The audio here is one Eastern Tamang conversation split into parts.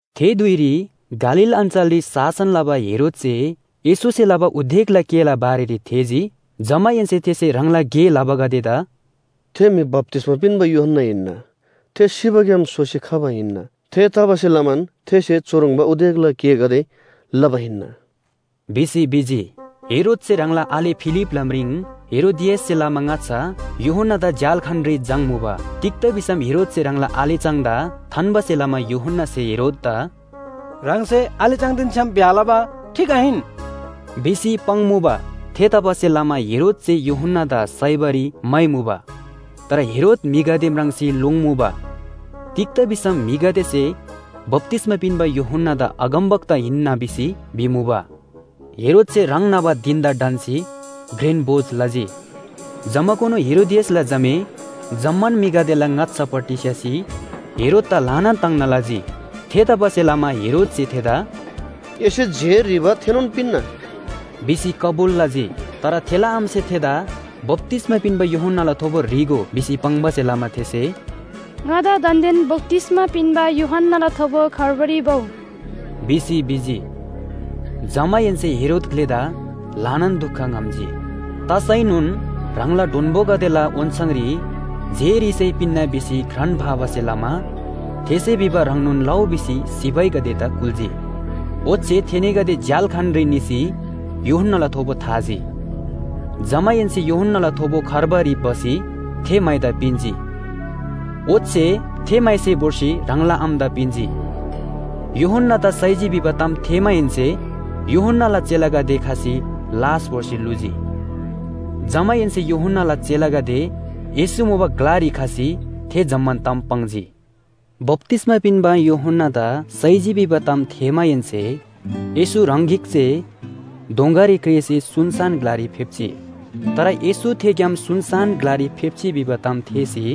थे धुइरी गालील अञ्‍चलरी शासन लबा हेरोदसे येशूसे लबा उदेकला गेला बारेरी थेःजी। जमाहेन्‍से थेसे ह्राङला गे लबागदेदा “थे म्‍हि बप्‍तिस्‍मा पिन्‍बा यूहन्‍ना हिन्‍ना। थे सिबाग्‍याम सोसी खबा हिन्‍ना। थेतबासेलमान थेसे चुह्रङ्बा उदेकला गेगदे लबा हिन्‍ना” भिसी भिजी। हेरोदसे ह्राङला आले फिलिपला म्रिङ हेरोदियाससे लमा ङाच्‍छा यूहन्‍नादा झ्‍याल्‍खानरी झाङ्मुबा। तिग्‍दा भिसम हेरोदसे ह्राङला आले चाङदा थान्‍बासे लमा यूहन्‍नासे हेरोददा “ह्राङसे आले चाङदेन छ्‌याम ब्‍याह लबा ठीक आहिन” भिसी पाङ्मुबा। थेतबासेलमा हेरोदसे यूहन्‍नादा साइबारी म्‍हाइमुबा। तर हेरोद म्‍हिगदे म्राङ्सी लोङ्मुबा। तिग्‍दा भिसम म्‍हिगदेसे बप्‍तिस्‍मा पिन्‍बा यूहन्‍नादा अगमवक्ता हिन्‍ना भिसी भिमुबा। हेरोदसे ह्राङ न्‍हबा धिन‍दा ढन्‍सी घ्रेन भोज लजी। जमाकुनु हेरोदियासला झामे जम्‍मान म्‍हिगदेला ङाच्‍छापट्टि स्‍य्‍हसी हेरोददा ल्‍हानान ताङ्ना लजी। थेतबासेलमा हेरोदसे थेदा “एसे जे ह्रीबा थेनोन पिन्‍ना” भिसी कबुल लजी। तर थेला आमासे थेदा बप्‍तिस्‍मा पिन्‍बा यूहन्‍नाला थोबो ह्री‍गो भिसी पाङ्बासे लमा थेसे “ङादा दान्‍देन बप्‍तिस्‍मा पिन्‍बा यूहन्‍नाला थोबो खार्बारी भउ” भिसी भिजी। जमाहेन्‍से हेरोद ग्‍लेदा ल्‍हानान दुख ङ्‌हम्‍जी। तसैनोन ह्राङला डोन्‍बोगदेला ओन्‍छाङरी जे ह्रीसै पिन्‍ना भिसी घ्रान फाबासे लमा थेसे भिबा ह्रङ्नोन लउ भिसी सिपाहीगदेदा कुल्‍जी। ओच्‍छे थेनीगदे झ्‍याल्‍खानरी निसी यूहन्‍नाला थोबो थाजी। जमाहेन्‍से यूहन्‍नाला थोबो खार्बारी भसी थे माइदा पिन्‍जी। ओच्‍छे थे माइसे भोर्सी ह्राङला आमादा पिन्‍जी। यूहन्‍नादा साइजी भिबा ताम थेःमाहेन्‍से यूहन्‍नाला चेलागदे खसी लास भोर्सी ल्‍हुजी। जमाहेन्‍से यूहन्‍नाला चेलागदे येशू मुबा ग्‍लारी खसी थे जम्‍मान ताम पाङ्जी। बप्‍तिस्‍मा पिन्‍बा यूहन्‍नादा साइजी भिबा ताम थेःमाहेन्‍से येशू ह्राङ गिक जे दोँगारी क्रेःसी सुनसान ग्‍लारी फेप्‍जी। तर येशू थेग्‍याम सुनसान ग्‍लारी फेप्‍जी भिबा ताम थेःसी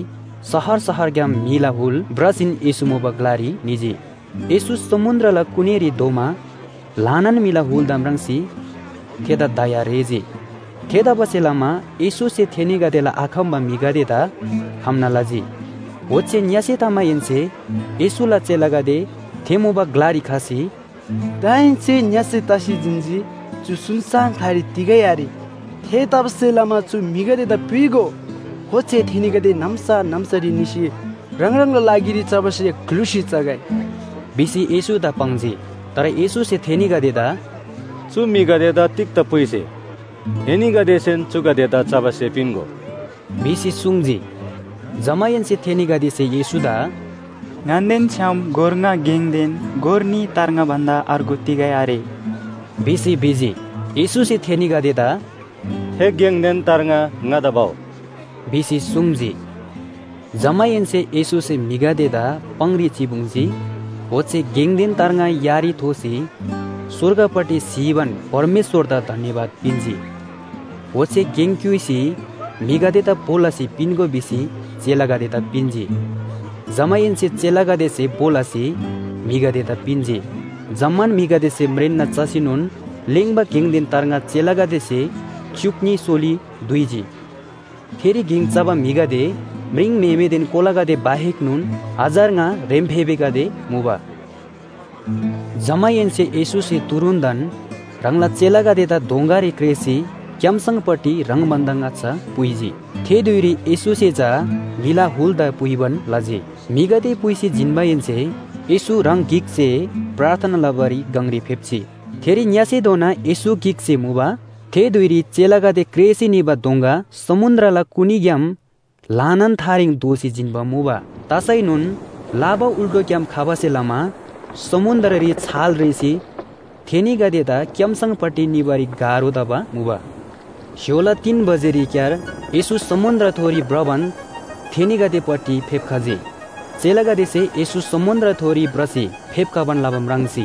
शहर शहरग्‍याम म्‍हिला हुल भ्रसीन येशू मुबा ग्‍लारी निजी। येशू समुन्‍द्रला कुनीरी धोमा ल्‍हानान म्‍हिला हुलदा म्राङ्सी थेदा दया रेःजी। थेतबासेलमा येशूसे थेनीगदेला आखम्‍बा म्‍हिगदेदा खम्‍ना लजी। ओच्‍छे ङ्‍यसे तमाहेन्‍से येशूला चेलागदे थे मुबा ग्‍लारी खसी “दाहेन्‍से ङ्‍यसे तसी जिन्‍जी, चु सुनसान ग्‍लारी तिगै आरे। थेतबासेलमा चु म्‍हिगदेदा पुइगो। ओच्‍छे थेनीगदे नाम्‍सा नाम्‍सारी निसी ह्राङ ह्राङला लागिरी चबा स्‍हे ग्‍लुसी चगै” भिसी येशूदा पाङ्जी। तर येशूसे थेनीगदेदा “चु म्‍हिगदेदा तिग्‍दा पुइसे? एनीगदेसेन चुगदेदा चबा स्‍हे पिन्‍गो” भिसी सुङ्जी। जमाहेन्‍से थेनीगदेसे येशूदा “ङन्‍देन छ्‌याम गोर ङा गेङदेन गोर न्‍ही तार्ङा भन्‍दा अर्गु तिगै आरे” भिसी भिजी। येशूसे थेनीगदेदा “थे गेङदेन तार्ङा ङादा भउ” भिसी सुङ्जी। जमाहेन्‍से येशूसे म्‍हिगदेदा पाङरी चिपुङ्जी। ओच्‍छे गेङदेन तार्ङा यारी थोसी स्‍वर्गपट्टि स्‍हीबान परमेश्‍वरदा धन्‍यवाद पिन्‍जी। ओच्‍छे गेङ क्‍युइसी म्‍हिगदेदा भो लसी पिन्‍गो भिसी चेलागदेदा पिन्‍जी। जमाहेन्‍से चेलागदेसे भो लसी म्‍हिगदेदा पिन्‍जी। जम्‍मान म्‍हिगदेसे म्रेन्‍ना चसीनोन लेङ्बा गेङदेन तार्ङा चेलागदेसे च्‍युक न्‍ही सोली दुइजी। थेरी गेङ चबा म्‍हिगदे म्रिङम्‍हेमेदेन कोलागदे बाहेकनोन हजार ङा ह्रेम्‍फेबेगदे मुबा। जमाहेन्‍से येशूसे तुरुन्‍तन ह्राङला चेलागदेदा दोँगारी क्रेःसी क्‍यामसङपट्टि ह्राङ भन्‍दा ङाच्‍छा पुइजी। थे धुइरी येशूसे चा म्‍हिला हुलदा पुइबान लजी। म्‍हिगदे पुइसी जिन्‍माहेन्‍से येशू ह्राङ गिक जे प्रार्थना लबारी गङरी फेप्‍जी। थेरी ङ्‍यसेधोनान येशू गिक जे मुबा। थे धुइरी चेलागदे क्रेःसी निबा दोँगा समुन्‍द्रला कुनीग्‍याम ल्‍हानान थारेङ धोसी जिन्‍बा मुबा। तसैनोन लाबा उल्‍टोग्‍याम खबासे लमा समुन्‍द्ररी छाल रेःसी थेनीगदेदा क्‍यामसङपट्टि निबारी गाह्रो तबा मुबा। स्‍य्‍होला तीन बजेरीक्‍यार येशू समुन्‍द्रथोरी भ्रबान थेनीगदेपट्टि फेप्‍खजी। चेलागदेसे येशू समुन्‍द्रथोरी भ्रसी फेप्‍खबान लबा म्राङ्सी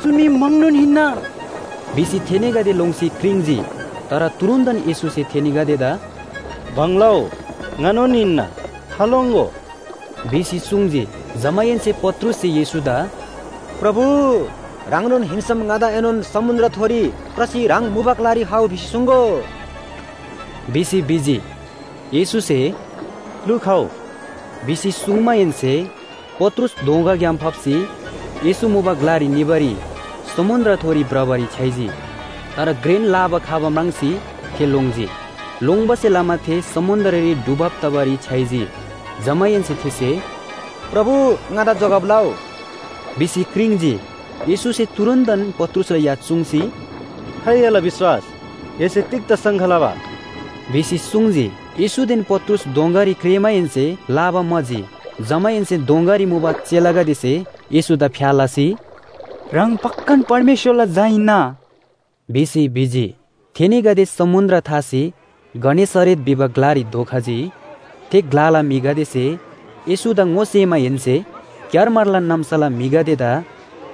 “चु मी म्‍हङनोन हिन्‍ना!” भिसी थेनीगदे लोङ्सी क्रिङ्‌जी। तर तुरुन्‍तन येशूसे थेनीगदेदा “भङ लउ, ङानोन हिन्‍ना, थालोङ्‍गो” भिसी सुङ्जी। जमाहेन्‍से पत्रुससे येशूदा “प्रभु, ह्राङनोन हिन्‍सम ङादाएनोन समुन्‍द्रथोरी भ्रसी ह्राङ मुबा ग्‍लारी खउ भिसी सुङ्‍गो” भिसी भिजी। येशूसे “लु, खउ!” भिसी सुङ्माहेन्‍से पत्रुस दोँगाग्‍याम फाप्‍सी येशू मुबा ग्‍लारी निबारी समुन्‍द्रथोरी भ्रबारी छ्‌याइजी। तर घ्रेन लाबा खबा म्राङ्सी थे लोङ्जी। लोङ्बासे लमा थे समुन्‍द्ररी डुबब तबारी छ्‌याइजी। जमाहेन्‍से थेसे “प्रभु, ङादा जोगब लउ” भिसी क्रिङ्‌जी। येशूसे तुरुन्‍तन पत्रुसला या चुङ्सी “खाइ एला विश्‍वास, एसे तिग्‍दा शङ्का लबा?” भिसी सुङ्जी। येशूदेन पत्रुस दोँगारी क्रेःमाहेन्‍से लाबा म्‍हाजी। जमाहेन्‍से दोँगारी मुबा चेलागदेसे येशूदा फ्‍या लसी, “ह्राङ पक्‍कान परमेश्‍वरला झा हिन्‍ना” भिसी भिजी। थेनीगदे समुन्‍द्र थासी गनेसरेत भिबा ग्‍लारी धोखजी। थे ग्‍लाला म्‍हिगदेसे येशूदा ङोसेमाहेन्‍से क्‍यारमारला नाम्‍साला म्‍हिगदेदा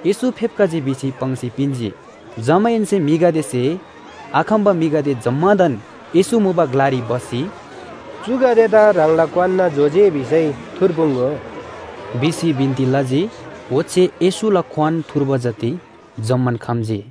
येशू फेप्‍खजी भिसी पाङ्सी पिन्‍जी। जमाहेन्‍से म्‍हिगदेसे आखम्‍बा म्‍हिगदे जम्‍मादान येशू मुबा ग्‍लारी भसी, “चुगदेदा ह्राङला क्‍वान्‍ना जो जे भिसै थुर्पुङ्‍गो” भिसी बिन्‍ती लजी, ओच्‍छे येशूला क्‍वान थुर्बा जति जम्‍मान खम्‍जी।